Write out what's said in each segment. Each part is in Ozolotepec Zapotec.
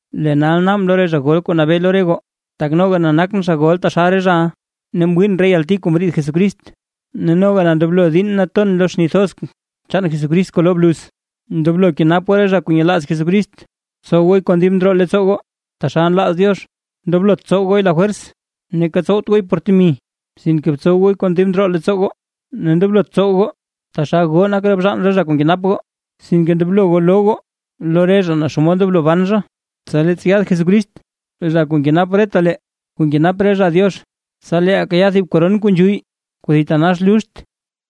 Lee nal naabʼn lo re zha gol kuu nabee lo re goo, tak noga na nakʼn zha gol taxal re zhaʼa, ne mwiin re yalti kuu mriid Jesucrist ne noga na ndoblon diinn na ton lo xni thoz chaan Jesucrist kuu loo bluz. Ndoblo kenap goo re zha kuu nyelaaz Jesucrist, btsow gooy kon dib ndroo leettsoo goo taxal nlaaz Diox, ndoblot tsow gooy lafwers, neeka tsowt gooy por temi, sinke btsow gooy kon dib ndroo leettsoo goo, ne ndoblot tsow goo taxal goo nak bzhaan re zha kuu nkenap goo, sinke ndoblo goo loo goo lo re zha naa xomod ndoblo ban zha. Tsa leettsa yaad Jesucrist Zha Kuu Nkenap retalee kuu nak zha Diox, tsa leeʼaa kayaa thib koron kuu nzhuyy kuu thitanax luxt.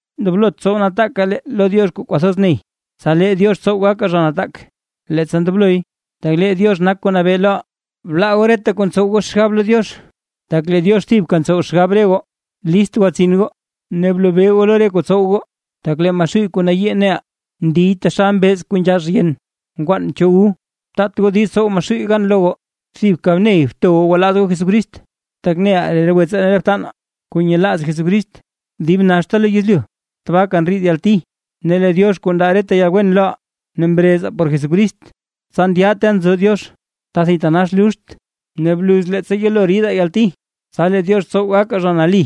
Ndoblot tsow nataakaa lee lo Diox kuu kwathoz ney, tsa lee Diox tsow gakaa zha nataak leettsa ndobloy, tak lee Diox nak kuu nabee loʼaa. Blaa goo reta kuu ntsow goo xgab lo Diox, tak lee Diox thibka ntsow xgab re goo. List gwatsin goo ne blobee goo lo re kuu tsow goo, tak lee Maxuuy kuu nayii neʼaa, ndiy taxal mbeez kuu nzhax yen nkwaan chu wu. Taat goo diiz tsow Maxuuy gan lo goo, thibka ney bto goo gwalaaz goo Jesucrist, tak neʼaa lee re wetsaa ne re btanaa kuu nyelaaz Jesucrist dib naxta lo yezlyu tabaaka ndriid yalti. Ne lee Diox kuu ndaa reta yalwen loʼaa ne mrezaa por Jesucrist, tsa ndyaʼaa ta nzo Diox, ta thitanax luxtaa, ne bluz leettsa yelo ridaa yalti, tsa lee Diox tsow gakaa zha nali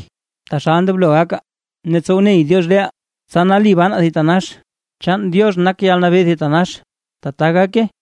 taxal ndoblo gakaa, ne tsow ney Diox reʼaa tsa nali banaa thitanax. Chaan Diox nak yalnabee thitanax. Tata gake.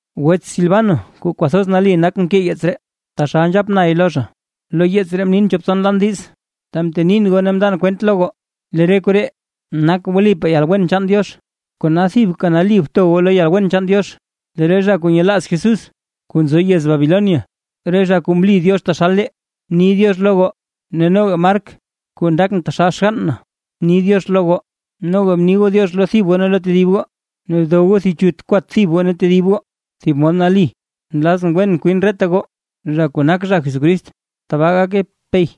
Wets Silvano kuu kwathoz nali nak mkee yeets ree, taxal nzhap nay lo zha. Lo yeets ree mnin chop tson lan diiz, ta mtenin goo ne mndan kwent lo goo lee re koree, nak wlipaa yalwen chaan Diox. Kona thibka nali bto goo lo yalwen chaan Diox. Lee re zha kuu nyelaaz Jesús kuu nzo yez Babilonia, re zha kuu mli Diox taxal lee, ni “diox” lo goo, ne noga Mark kuu ndakʼn taxal xgann na ni “diox” lo goo. Noga bni goo “diox” lo thib goo ne lo tedib goo, ne dow goo thib chut kwat thib goo ne tedib goo thib mod nali. Nlazʼn wen kwin reta goo zha kuu nak zha Jesucrist. ¡Tbaa gake! Pey